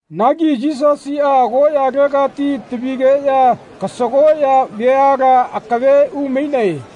Nagi Yisasiꞌa agoꞌyalegati tavigeꞌya kasagoꞌya veala akave umainae.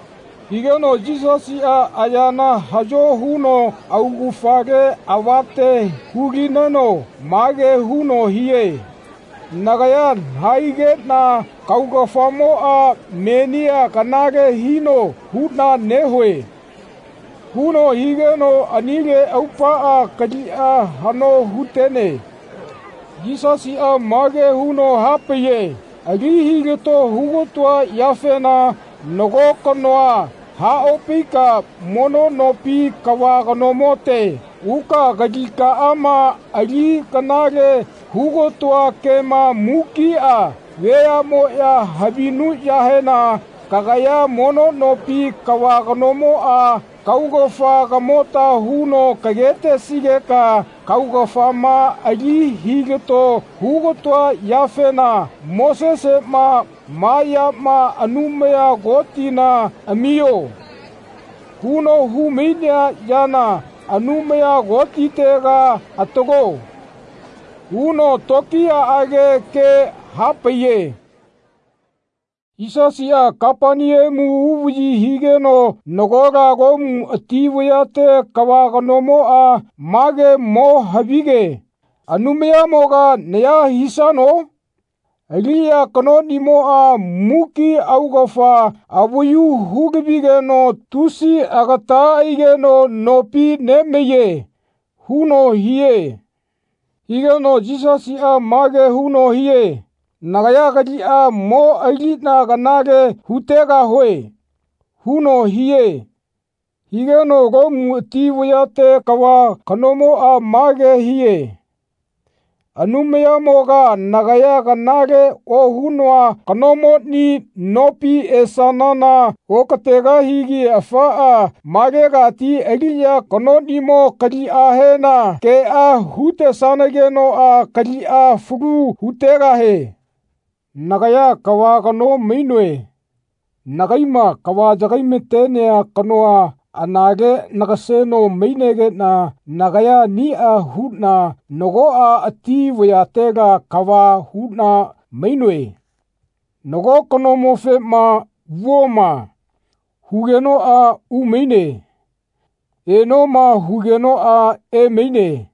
Higeno Yisasiꞌa ayana haꞌyo huno augafale avate hu-lineno mage huno hie “Nagaya nahaigeꞌna kaugafamoꞌa menia kanale hino huꞌna nehue.” huno higeno anile aupaꞌa kaliꞌa haꞌno hu-tene. Yisasiꞌa mage huno hapaiye “Ali hilato hu-ga-toa yafena nago kanoa haꞌopaika mono nopi kava kanomote uka kalikaꞌama ali kanale hu-ga-toa kema mukiꞌa veaꞌmoꞌya havinuꞌyahena kagaya mono nopi kava kanomoꞌa kaugafa kamota huno kage-tesigeka kaugafama ali hilato hu-ga-toa yafena Moseseꞌma ‘Ma yama Anumaya Kotina amio.’ huno hu-mainea yana Anumaya Kotitega atalo.” huno tokiyaꞌage ke hapaiye. Yisasiꞌa Kapaneamu uvaꞌyi higeno nagola Lomu ati vayate kava kanomoꞌa mage mo havige “Anumayamoga naya hisano? Aliꞌya kanoꞌnimoꞌa muki augafa avayu hu-lavigeno tusi agata aigeno nopi nemaiye.” huno hie. Higeno Yisasiꞌa mage huno hie “Nagaya kaliꞌa mo aliꞌna kanale hu-tegahue.” huno hie. Higeno Lomu ati vayate kava kanomoꞌa mage hie “Anumayamoga nagaya kanale ohunoa kanomoni nopi esanana okategahigi afaꞌa malegati aliꞌya kanoꞌnimo kaliꞌahena keꞌa hu-tesanageno kaliꞌa falu hu-tegahie. Nagaya kava kano mainoe. Nagaiꞌma kava yagai-natenea kanoa anale nagaseno maigeꞌna nagaya aniꞌa huꞌna nagoꞌa ati vayatela kava huꞌna mainoe. Nago kanomofema ‘Vuoma.’ hugenoꞌa umaine. ‘Enoma.’ hugenoꞌa emaine.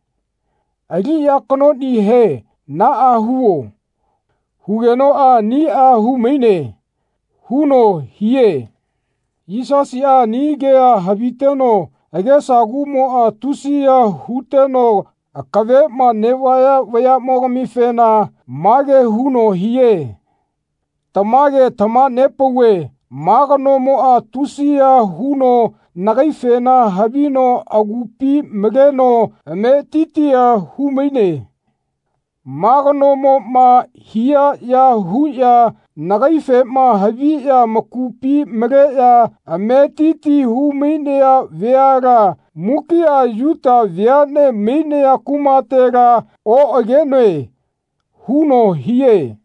Aliꞌya kanoꞌnihe ‘Naꞌa huo.’ hugenoꞌa aniꞌa hu-maine.” huno hie. Yisasiꞌa ani kea haviteno agesa kuꞌmoꞌa tusiya huteno akaveꞌma neꞌvaya veaꞌmogamifena mage huno hie “Tamage tamaha-nepauve ma kanomoꞌa tusiya huno nagaifena havino agupi maleno ametitia hu-maine. Ma kanomoꞌma hia ya huꞌya nagaifema haviꞌya amakupi maleꞌya ametiti hu-mainaya veala mukiꞌa Yuta veaꞌne mainaya kumatela oꞌagenoe.” huno hie.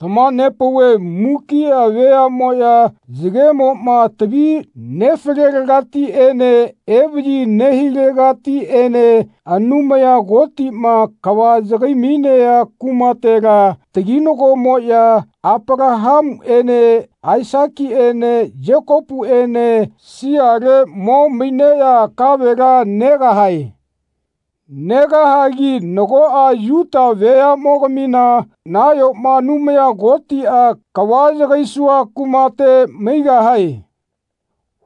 Tamaha-nepauve mukiꞌa veaꞌmoꞌya yagemoꞌma tavi nefalelegatiꞌene evaꞌyi nehilegatiꞌene Anumaya Kotiꞌma kava yagai-mainea kumatela taginagomoꞌya Apalahamuꞌene Aisakiꞌene Yekopuꞌene siale mo maineꞌya kavela negahae. Negahagi nagoꞌa Yuta veaꞌmogamina nayoma Anumaya Kotiꞌa “Kava yagaisua kumate maigahae.”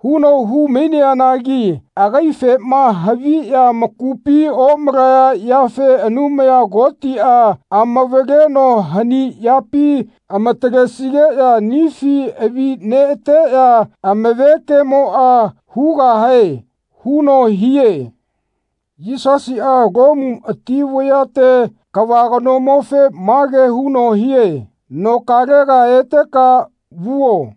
huno hu-maineanagi agaifema haviꞌya amakupi omalaya yafe Anumaya Kotiꞌa amavaleno hani yapi amatalesigeꞌya anifi avi neꞌateꞌya amave kemoꞌa hugahae huno hie. Yisasiꞌa Lomu ati vayate kava kanomofe mage huno hie “Nokalega eteka vuo.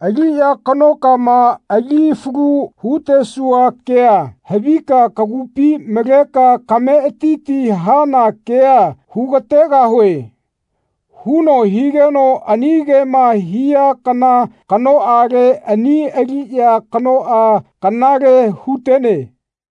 Aliꞌya kanokama ali falu hu-tesua kea havika kagupi maleka kametiti hana kea hu-ga-tegahue.” huno higeno ani kema hia kana kanoꞌale ani aliꞌya kanoꞌa kanale hu-tene.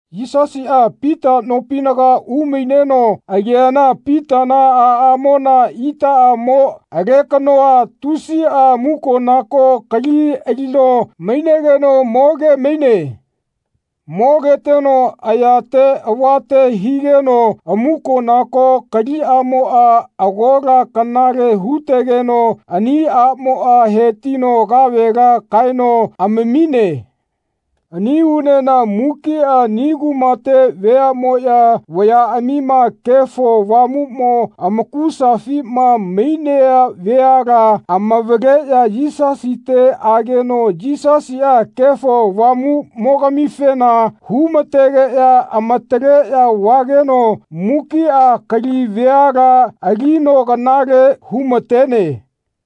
Yisasiꞌa Pita nopinaga umaineno ageana Pitana aꞌamona itaꞌamo alekanoa tusiꞌa amukonako kali alino mainegeno moge-maine. Mogeteno ayate avate nehigeno amuko-nako kaliꞌamoꞌa agola kanale hu-tetegeno ani aꞌmoꞌa hetino kavela kaeno amamine. Ani unena mukiꞌa ani kumate veaꞌmoꞌya vayaꞌamima Kefo Avamuꞌmo amakusafima mainea veala amavaleꞌya Yisasite ageno Yisasiꞌa Kefo Avamuꞌmogamifena hu-mategeꞌya amataleꞌya vageno mukiꞌa kali veala alino kanale hu-matene.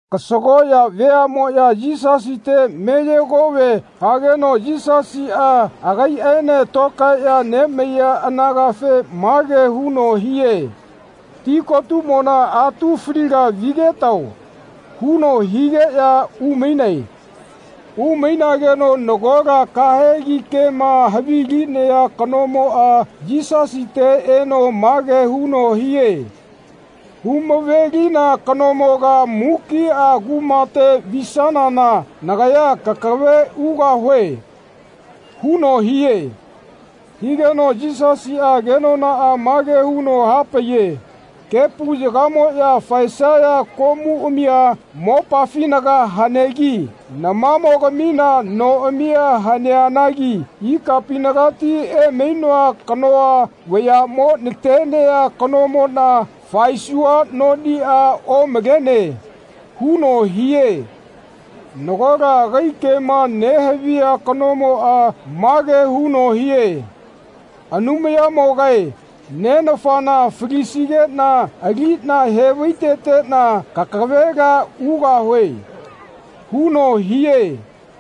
Kasagoꞌya veaꞌmoꞌya Yisasite meye-kove hageno Yisasiꞌa agaiꞌaene tokaeꞌya nemaiya anagafe mage huno hie “Tikotumona atu faliga vigetao.” huno higeꞌya umainae. Umainageno nagola kahegi kema havilinea kanomoꞌa Yisasite eno mage huno hie “Hu-mave-lina kanomoga mukiꞌa kumate visanana nagaya kakave ugahue.” huno hie. Higeno Yisasiꞌa kenonaꞌa mage huno hapaiye “Kepu yagamoꞌya faesaya komuꞌamia mopafinaga hanegi namamogamina noꞌamia haneanagi ikapinagati emainoa kanoa vayaꞌmo natenea kanomoꞌna faesua noniꞌa omalene.” huno hie. Nagola agai kema nehavia kanomoꞌa mage huno hie “Anumayanimogae nenafana falisigeꞌna aliꞌna he-vai-teteꞌna kakavela ugahue.” huno hie.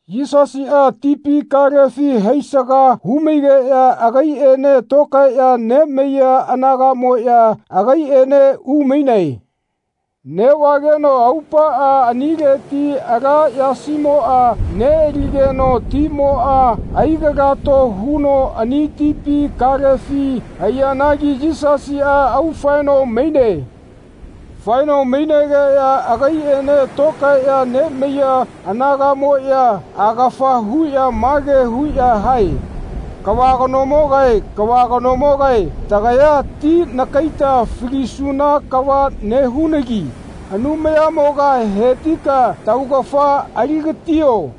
Yisasiꞌa tipi kalefi haisaga hu-maigeꞌya agaiꞌene tokaeꞌya nemaiya anagaꞌmoꞌya agaiꞌene umainae. Neꞌvageno aupaꞌa anileti ala yasimoꞌa neꞌaligeno timoꞌa ai-galato huno ani tipi kalefi haiyanagi Yisasiꞌa aufaeno maine. Faeno mainegeꞌya agaiꞌene tokaeꞌya nemaiya anagaꞌmoꞌya agafa huꞌya mage huꞌya hae “Kava kanomogae kava kanomogae tagaya ti nakaita falisuna kava nehunagi Anumayamoga hetika taugafa ali-gatio.”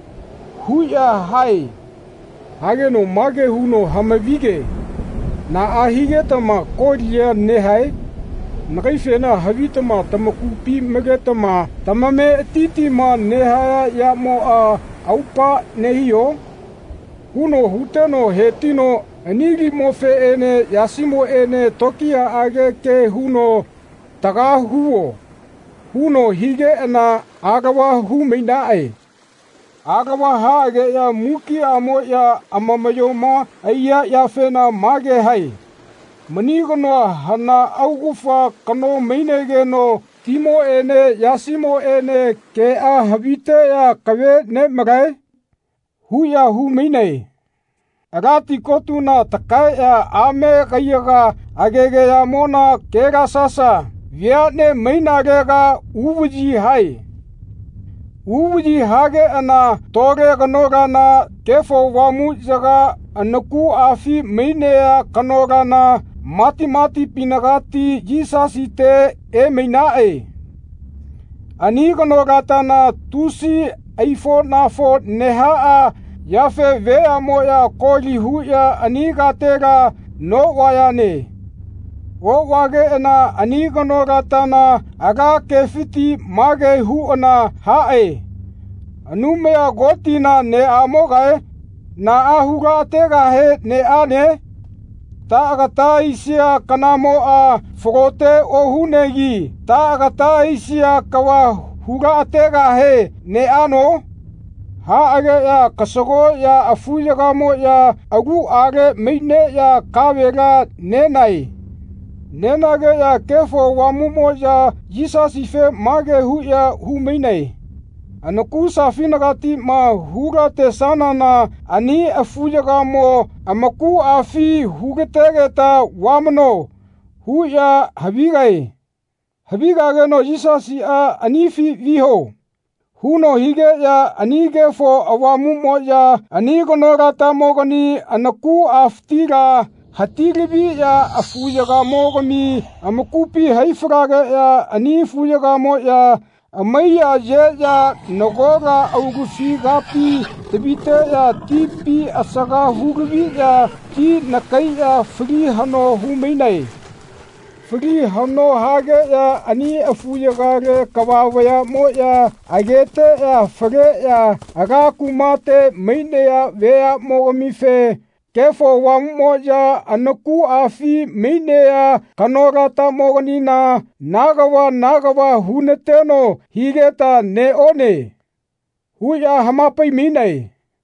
huꞌya hae. Hageno mage huno hama-vi-ge “Naꞌa higetama kolia nehae? Nagaifena havitama tamakupi maletama tamametitima nehaya yamoꞌa aupa nehio?” huno huteno hetino ani limofeꞌene yasimofeꞌene tokiyaꞌage ke huno “Taga huo.” huno higeꞌana alava hu-mainaꞌe. Alava haꞌageꞌya mukiꞌamoꞌya amamaꞌyoma aiya yafena mage hae “Mani kanoa hana augafa kano mainegeno timoꞌene yasimoꞌene keꞌa haviteꞌya akave nemalae?” huꞌya hu-mainae. Ala tikotuna takaeꞌya ame kaiyaga agegayamona Kelasasa veaꞌne mainalega uvaꞌyi hae. Uvaꞌyi hageꞌana tole kanolana Kefo Avamuꞌyaga anakuꞌafi mainea kanolana matimatipinagati Yisasite emainaꞌe. Ani kanolatana tusi aifoꞌnafo nehaꞌa yafe veaꞌmoꞌya koli huꞌya ani katela noꞌvayane. Oꞌvageꞌana ani kanolatana ala kefiti mage huꞌana haꞌe “Anumaya Kotina neꞌamogae naꞌa hu-laꞌategahe neꞌane? Taꞌagata aisia kanamoꞌa falote ohunegi taꞌagata aisia kava hu-laꞌategahe neꞌano?” Haꞌageꞌya kasagoꞌya afuyagamoꞌya aluꞌale maineꞌya kavela nenae. Nenageꞌya Kefo Avamuꞌmoꞌya Yisasife mage huꞌya hu-mainae “Anakusafinagatiꞌma hu-latesanana ani afuyagamo amakuꞌafi hu-lategeta vamano.” huꞌya havigae. Havigageno Yisasiꞌa “Anifi viho.” huno higeꞌya ani Kefo Avamuꞌmoꞌya ani kanolatamogani anakuꞌafitila hati-laviꞌya afuyagamogami amakupi hai-falageꞌya ani afuyagamoꞌya amaiya-yeꞌya nagola aulufi kapi taviteꞌya tipi asaga hu-laviꞌya ti nakaiꞌya fali haꞌno hu-mainae. Fali haꞌno hageꞌya ani afuyagale kava vayaꞌmoꞌya ageteꞌya faleꞌya ala kumate mainaya veaꞌmogamife “Kefo Avamuꞌmoꞌya anakuꞌafi mainea kanolatamoganina na kava na kava hu-nateno higeta neꞌone.” huꞌya hama-pai-mainae.